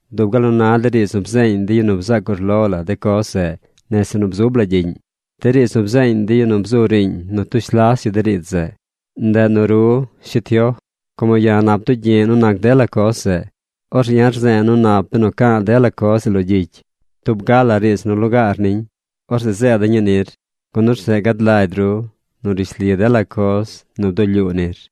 dub gal nu na de riidz nu bzeeñ de yu nu bzac urlo la de coz zeꞌ nese nu bzub la gyiꞌñ, de riidz nu bzeeñ de yu nu bzu riiñ nu tush las yu de riidz zeꞌ. Ndeꞌ nu ru, shi Tioj, como ya̱ nap bdugyi̱ꞌ nu nac dela coz zeꞌ, orzeꞌ ya̱ rze̱e̱ nu nap benu ca̱a̱ dela coz zeꞌ lo gyicy, tub ga la riidz nu lugaar niñ. Orzeꞌ zeeda̱ ñii nir. Gun orzeꞌ gad lagy ru nu rishli dela coz nu bdulyuu nir.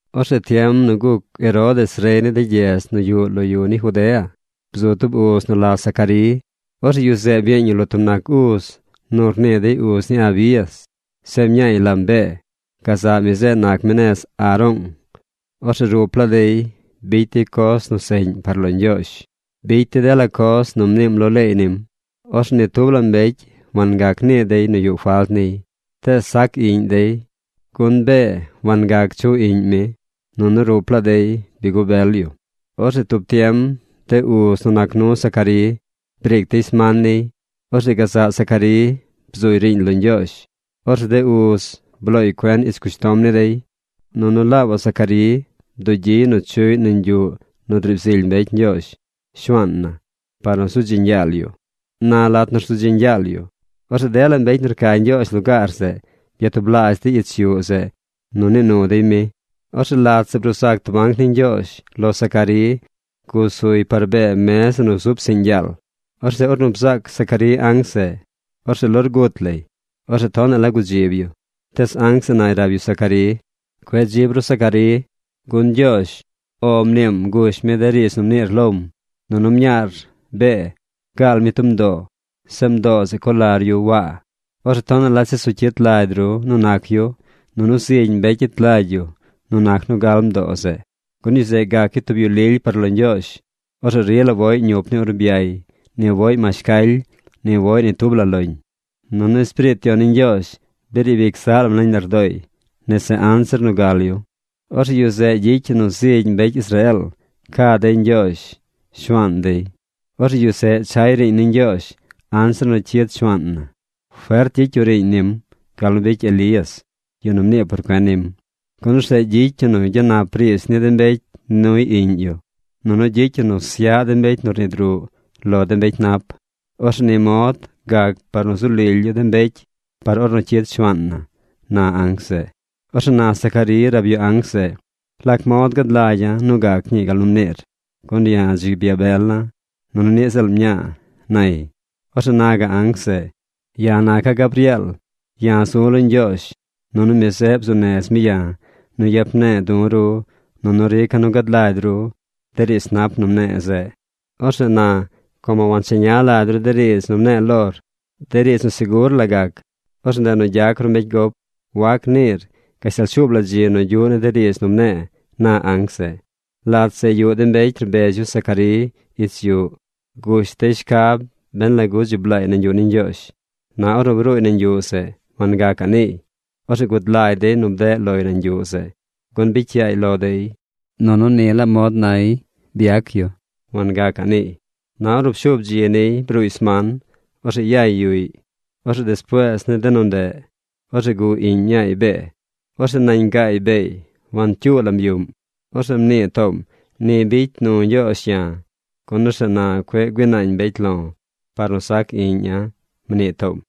Orzeꞌ tiem nu guc Herodes rey ni de gyedz nu yuꞌ lo yu ni Judea, bzu tub uz nu la Zacarí. Orzeꞌ yu zeꞌ byeeñ yu lo tub nac uz nu rnii dey uz ni Abías. Zeꞌ mñaay lam Bee. Gazaꞌ mi zeꞌ nac mi nez Aroong. Orzeꞌ rup laa dey bicy dey coz nu seꞌñ par lo Ñgyoozh. Bicy dey dela coz nu mniim lo leey nim. Orzeꞌ ni tub la mbecy wangac nii dey nu yuꞌ falt niy. Tees sac iꞌñ dey, gun Bee wangac chuꞌ iꞌñ mi. Nunu rup laa dey bi gubel yu. Orzeꞌ tub tiem de uz nu nac nu Zacarí briic dey sman niy. Orzeꞌ gazaꞌ Zacarí bzuy riiñ lo Ñgyoozh. Orzeꞌ de uz blooy cuen ich cushtom ni dey, nunu laabaꞌ Zacarí bdugyiy nu chuꞌy nañ yuꞌ nu driib zily mbecy Ñgyoozh, Shuaan na, par nu zu dzeeñ yaal yu. Na lat nu rzu dzeeñ yaal yu, orzeꞌ dela mbecy nu rca Ñgyoozh lugaar zeꞌ byatublaazh dey ich yuꞌ zeꞌ nu nii nu dey mi. Orzeꞌ lat zeꞌ bruu zac tub anc ni Ñgyoozh lo Zacarí gusuy par bee mez zeꞌ nu zub psiꞌñ yaal. Orzeꞌ ornu bzaac Zacarí anc zeꞌ, orzeꞌ lorgut lay. Orzeꞌ tonaꞌ la gudzib yu. Tees anc zeꞌ nay rab yu Zacarí: ―Cueꞌ dzib ru Zacarí, gun Ñgyoozh “O” mniim gush mi de riidz nu mniir lom, nunu mñaar, Bee, gaal mi tub mdoo. Zeꞌ mdoo zeꞌ co lar yu Waa. Orzeꞌ tonaꞌ la chesu cyit lagy ru nu nac yu, nunu zigy mbecy gyet lagy yu nu nac nu gal mdoo zeꞌ. Gun yu zeꞌ gac yu tub yu lily par lo Ñgyoozh. Orzeꞌ rila woꞌy ñup ni urbyay. Ni woꞌy mashcaly. Ni woꞌy ni tub la loñ. Nunu Espiriit Yon ni Ñgyoozh bi riib ic zaꞌ lam nañ lardooy nese anzir nu gal yu. Orzeꞌ yu zeꞌ gyicy yu nu zigy mbecy Israeel ca dey Ñgyoozh, Shuaan dey. Orzeꞌ yu zeꞌ chay riiñ ni Ñgyoozh anzir nu cyid Shuaan na. Fert gyicy yu riiñ nim gal nu bicy Elías, yu nu mnii por cuen nim. Gun orzeꞌ gyicy yu nu gyanap riidz ni de mbecy nuy iꞌñ yu, nunu gyicy yu nu syaꞌ de mbecy nu rnid ruꞌ lo de mbecy nap. Orzeꞌ ni mod gac par nu zu lily yu de mbecy par ornu cyid Shuaan na ―na anc zeꞌ. Orzeꞌ na Zacarí rab yu anc zeꞌ: ―¿Lac mod gad lagya̱ nu gac ñii gal nu mniir? Gun ya̱ dzi byabela̱. Nunu niꞌ ziꞌl mña̱a̱ ―nay. Orzeꞌ na gaꞌ anc zeꞌ: ―Ya̱ naca̱ Gabrieel. Ya̱ zu̱ lo Ñgyoozh. Nunu mi zeꞌ bzuu nez mi ya̱ nu yap ne̱e̱ du̱ ru nunu rica̱ nu gad lagy ru de riidz nap nu mne̱e̱ zeꞌ. Orzeꞌ na, como wancheña lagy ru de riidz nu mne̱e̱ lor, de riidz nu segur la gac, orzeꞌ ndeꞌ nu gyac ru mbecy gop. Wac niir gashtal shuub la dzi nu gyuꞌ ni de riidz nu mne̱e̱ ―na anc zeꞌ. Lat zeꞌ yuꞌ de mbecy rbez yu Zacarí ich yuꞌ. Gush dey shcab ben lagu dzi blaay nañ yuꞌ ni Ñgyoozh. Na ornu bruuy nañ yuꞌ zeꞌ, wangacaꞌ niiy. Orzeꞌ gud lagy dey nu bdeꞌ loy nañ yuꞌ zeꞌ, gun bicy yaay lo dey. Nunu ni la mod nay byeeñ yu. Wangacaꞌ niiy. Na ornu pshuub dzi niy bruuy sman, orzeꞌ yay yuꞌy. Orzeꞌ despuees ni de nu ndeꞌ, orzeꞌ guꞌ iꞌñ mñaay Bee. Orzeꞌ nañ gaay beey wancyuu lam yuꞌm. Orzeꞌ mnii toom: “Ni bicy nu Ñgyoozh ya̱, gun orzeꞌ na cueꞌ güii naañ mbecy lo̱ par nu sac iꞌña̱”, mnii toom.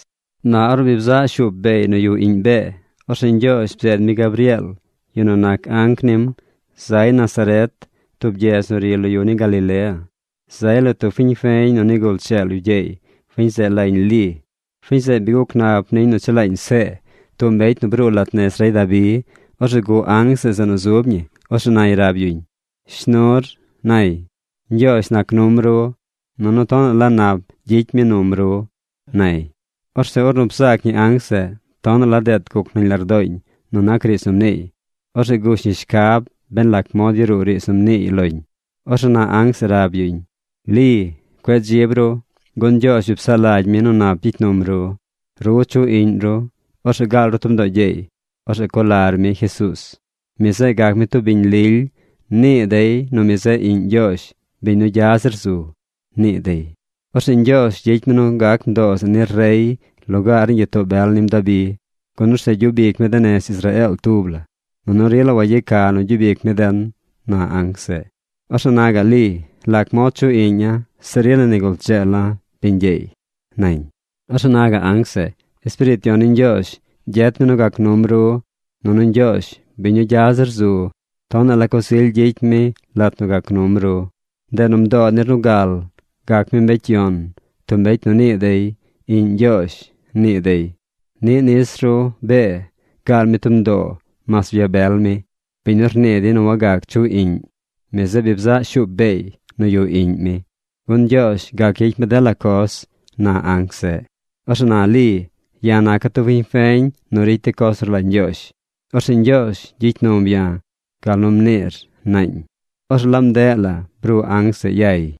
Na ornu bi bzaꞌ shuup beey nu yuꞌ iꞌñ Bee, orzeꞌ Ñgyoozh bzeed mi Gabrieel, yu nu nac anc nim, zay Nazaret, tub gyedz nu ri lo yu ni Galilea. Zay lo tub fiñ feñ nu nigul dzeel yu gyeey. Fiñ zeꞌ lañ Li. Fiñ zeꞌ bi guc nap niñ nu chelaañ See, tub mbecy nu bruu lat nez rey Dabi. Orzeꞌ guꞌ anc zeꞌ zeꞌ nu zub ñi. Orzeꞌ nay rab yuñ: ―¡Shnur! ―nay―. Ñgyoozh nac num ru, nunu tonaꞌ la nap gyicy mi num ru ―nay. Orzeꞌ ornu bzaac ñi anc zeꞌ, tonaꞌ la deet guc nañ lardooñ nu nac riidz nu mniiy. Orzeꞌ gush ñi shcab ben lac mod yaruu riidz nu mniiy loñ. Orzeꞌ na anc zeꞌ rab yuñ: ―Li, cueꞌ dzib ru, gun Ñgyoozh bi psaꞌ lagy mi nu nap gyicy num ru. Ru chuꞌ iꞌñ ru. Orzeꞌ gaal ru tub mdoo gyeey. Orzeꞌ co lar mi Jesuuz. Mi zeꞌ gac mi tub biñ lily. Nii dey nu “Mi zeꞌ iꞌñ Ñgyoozh biñ nu gya zir zu”, nii dey. Orzeꞌ Ñgyoozh gyicy mi nu gac mdoo zeꞌ nir rey lugaar ni gyitoo bel nim Dabi, gun orzeꞌ gyub ic mi de nez Israeel tub la, nunu rila wayeca nu gyub ic mi den ―na anc zeꞌ. Orzeꞌ na gaꞌ Li: ―¿Lac mod chuꞌ iꞌña̱ zeꞌ rila nigul dzeela̱ biñ gyeey? ―nañ. Orzeꞌ na gaꞌ anc zeꞌ: ―Espiriit Yon ni Ñgyoozh gyet mi nu gac num ru. Nunu Ñgyoozh, biñ nu gya zir zu, tonaꞌ la coz ily gyicy mi lat nu gac num ru. Ndeꞌ nu mdoo nir nu gal gac mi mbecy yon, tub mbecy nu nii dey “Iꞌñ Ñgyoozh”, nii dey. Niꞌ nis ru, Bee, gaal mi tub mdoo mas byabel mi. Biñ nu rnii dey nu wagac chuꞌ iꞌñ, mi zeꞌ bi bzaꞌ shuup beey nu yuꞌ iꞌñ mi, gun Ñgyoozh gac gyicy mi dela coz ―na anc zeꞌ. Orzeꞌ na Li: ―Ya̱ naca̱ tub fiñ feñ nu ricy de coz nu rlagy Ñgyoozh. Orzeꞌ Ñgyoozh gyicy num ya̱ gal nu mniir ―naañ. Orzeꞌ laab ndeꞌ la bruu anc zeꞌ yay.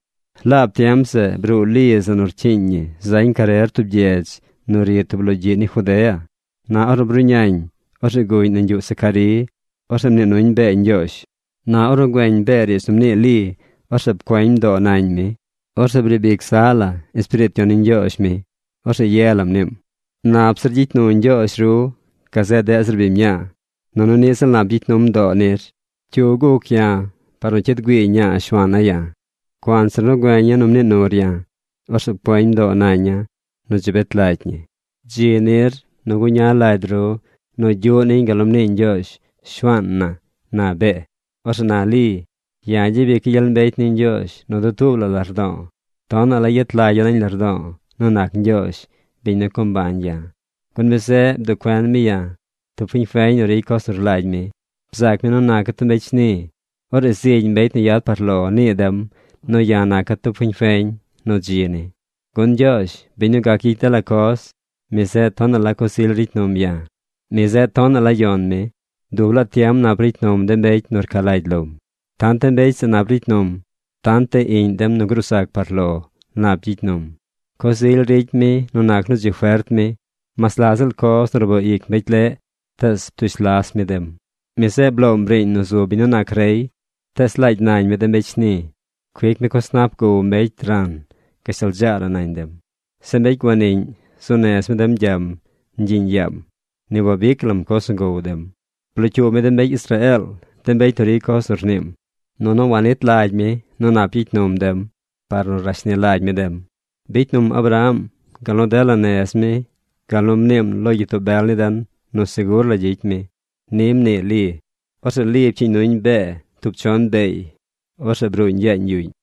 Laab tiem zeꞌ bruu Li zeꞌ nu rcyiiñ ñi zañ carer tub gyedz nu ri tub logyiꞌ ni Judea. Na ornu bruꞌñañ, orzeꞌ guꞌñ nañ yuꞌ Zacarí. Orzeꞌ mnii nuñ Bee ñgyoozh. Na ornu güeñ Bee riidz nu mnii Li, orzeꞌ pcueñ mdoo nañ mi. Orzeꞌ briib ic zaꞌ la Espiriit Yon ni Ñgyoozh mi. Orzeꞌ ye la mniim: ―¡Nap zir gyicy nu Ñgyoozh ru gazeꞌ deꞌ zir biñ mñaa! ¡Nunu niꞌ ziꞌl nap gyicy num mdoo nir! ¿Cyu guc ya̱ par nu cyid güii ñaa Shuaana̱ ya̱? Cuanzir nu güeña̱ nu mnii nur ya̱, orzeꞌ pcueñ mdoo naña̱ nu dzi bet lagy ñi. Dzi nir nu guña lagy ru nu gyuꞌ niñ gal nu mnii Ñgyoozh, Shuaan na ―na Bee. Orzeꞌ na Li: Ya̱ gyabica̱ gyel mbecy ni Ñgyoozh nu dutuub la lardo̱o̱. Tonaꞌ la yet lagya̱ nañ lardo̱o̱ nu nac Ñgyoozh, biñ nu co mbañ ya̱. Gun mi zeꞌ bduꞌ cuen mi ya̱, tub fiñ feñ nu ricy coz nu rlagy mi. Bzaac mi nu naca̱ tub mbecy shni. Orzeꞌ zigy mbecy nu yad par lo nii dem nu ya̱ naca̱ tub fiñ feñ nu dzi ni. Gun Ñgyoozh, biñ nu gac gyicy dela coz, mi zeꞌ tonaꞌ la coz ily ricy num ya̱. ¡Mi zeꞌ tonaꞌ la yon mi! Dub laa tiem nap ricy num de mbecy nu rca lagy lom. Tant de mbecy zeꞌ nap ricy num, tant iꞌñ dem nu gruu zac par lo nap gyicy num. Coz ily ricy mi nu nac nu dzi fert mi. Mas la ziꞌl coz nu rboo ic mbecy leꞌ, tees ptush las mi dem. Mi zeꞌ bloom riiñ nu zu biñ nu nac rey. Tees laagy nañ mi de mbecy shni. Cuic mi coz nap gow mbecy ran gashtal dzaa la nañ dem. Zeꞌ mbecy guaniꞌñ, zuu nez mi dem gyam ñgyiꞌñ yaam. Ni wabic lam coz nu gow dem. Blocyuub mi de mbecy Israeel, de biñ nu ricy coz nu rniim. Nunu wanit lagy mi nu nap gyicy num dem par nu rashni lagy mi dem. Bicy num Abraham gal nu dela nez mi gal nu mniim lo de gyitoo bel ni den nu segur la gyicy mi. Ni mnii Li. Orzeꞌ Li pcyiiñ nuñ Bee tub chon beey. Orzeꞌ bruuñ yaañ yuꞌñ.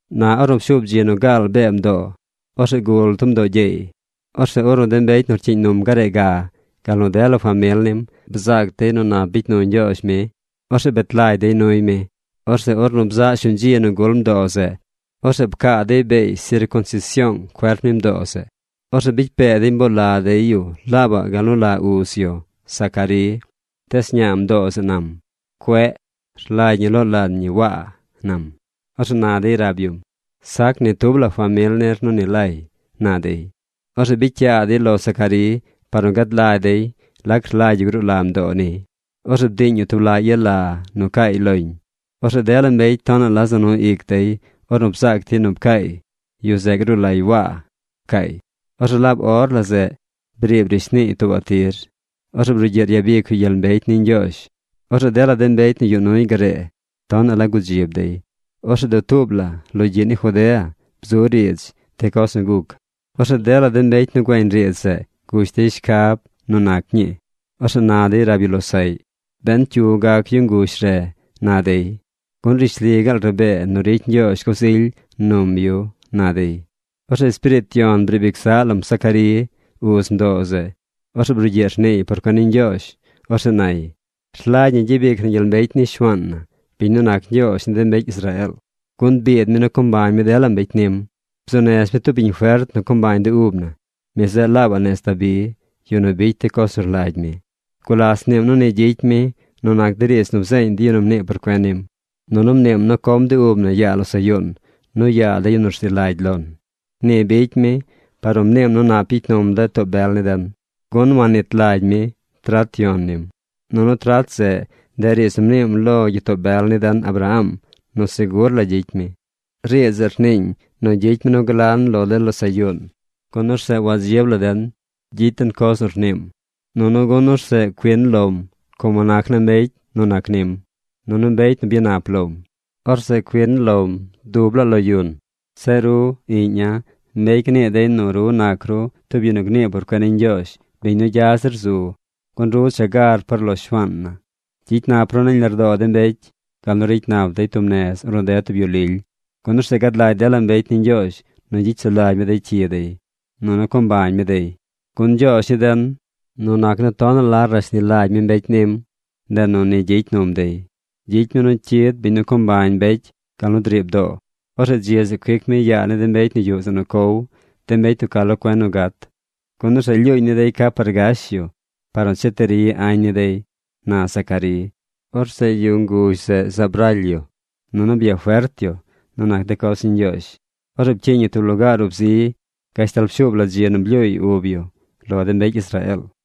Na ornu pshuub dzi nu gaal Bee mdoo, orzeꞌ gul tub mdoo gyeey. Orzeꞌ ornu de mbecy nu rcyiiñ num garee ga, gal nu dela famil nim bzaac dey nu nap bicy nu Ñgyoozh mi, orzeꞌ bet lagy dey nuy mi. Orzeꞌ ornu bzaꞌ shuñ dzi nu gul mdoo zeꞌ, orzeꞌ pcaa dey beey sircunsision cuerp ni mdoo zeꞌ. Orzeꞌ bicy pee dey mboo la dey yu laabaꞌ gal nu la uz yu, Zacarí. Tees ñaa mdoo zeꞌ nam: ―¡Cueꞌ! Rlagy ñi loo lan ñi Waa ―nam. Orzeꞌ na dey rab yum: ―Sac ni tub la famil nir nu ni lay ―na dey. Orzeꞌ bicy yaa dey lo Zacarí par nu gad lagy dey lac rlagy yu gruu la mdoo niy. Orzeꞌ bdiiñ yu tub laꞌ yala nu caay loñ. Orzeꞌ dela mbecy tonaꞌ la za nu ic dey ornu bzaac dey nu pcaay: “Yu zeꞌ gruu lay Waa”, pcaay. Orzeꞌ laab or la zeꞌ briib rishniiy tuubaꞌ tir. Orzeꞌ brugyiꞌ ryabic yu gyel mbecy ni Ñgyoozh. Orzeꞌ dela de mbecy nu yuꞌ nuy garee tonaꞌ la gudzib dey. Orzeꞌ dutuub la logyiꞌ ni Judea bzu riidz de coz nu guc. Orzeꞌ dela mbecy nu güeñ riidz zeꞌ gush dey shcab nu nac ñii. Orzeꞌ na dey rab yu losaꞌy: ―¿Ben cyu gac yu nguzh zeꞌ? ―na dey―. Gun rishli gaal rabee nu ricy Ñgyoozh coz ily num yu ―na dey. Orzeꞌ Espiriit Yon briib ic zaꞌ lam Zacarí, uz mdoo zeꞌ. Orzeꞌ brugyiꞌ rniiy por cuen ni Ñgyoozh. Orzeꞌ nay: ¡Rlagy ñi gyabic na gyel mbecy ni Shuaan na, biñ nu nac Ñgyoozh ni de mbecy Israeel! Gun biid mi nu co mbañ mi dela mbecy nim. Bzuu nez mi tub biñ fert nu co mbañ de ub na. Mi zeꞌ laabaꞌ nez Dabi, yu nu bicy de coz nu rlagy mi. Gulas mniim nu ni gyicy mi nu nac de riidz nu bzeeñ de yu nu mnii por cuen nim. Nunu mniim nu com de ub na yaa losaꞌ yuun nu yaa de yu nu rzi lagy lon. Ni bicy mi par nu mniim nu nap gyicy num de too bel ni den. Gun wannit lagy mi trat yon nim. Nunu trat zeꞌ, ndeꞌ riidz nu mniim lo gyitoo bel ni den Abraham nu segur la gyicy mi. Riidz zeꞌ rniiñ nu gyicy mi nu glan lo de losaꞌ yuun, gun orzeꞌ wadzib la den gyicy den coz nu rniim, nunu gun orzeꞌ cuin lom como nac naa mbecy nu nac nim, nunu mbecy nu bi byanap lom. Orzeꞌ cuin lom dutuub la lo yun. Zeꞌ ru, iꞌña̱, mbecy gnii dey nu ru nac ru tub yu nu gnii por cuen ni Ñgyoozh, biñ nu gya zir zu, gun ru cha gar par lo Shuaan na. Gyicy nap ru nañ lardoo de mbecy gal nu ricy nap dey tub nez ornu ded tub yu lily. Gun orzeꞌ gad lagy dela mbecy ni Ñgyoozh nu gyicy sulagy mi de cyi dey. Nunu co mbañ mi dey. Gun Ñgyoozh ni den, nu nac nu tonaꞌ la rashni lagy mi mbecy nim, ndeꞌ nu ni gyicy num dey. Gyicy mi nu cyid biñ nu co mbañ mbecy gal nu driib doo. Orzeꞌ dzi zeꞌ cuic mi yaa ni de mbecy nu yuꞌ zeꞌ nu cow, de mbecy nu ca lo cuen nu gat, gun orzeꞌ lyuuñ ni dey ca par gash yu par nu che ti ri añ ni dey, na Zacarí. Orzeꞌ yu nguzh zeꞌ zaab raly yu, nunu byafert yu nu nac de coz ni Ñgyoozh. Orzeꞌ pcyiiñ yu tub lugaar ub zi gashtal pshuub la dzi nu blyuuy ub yu lo de mbecy Israeel.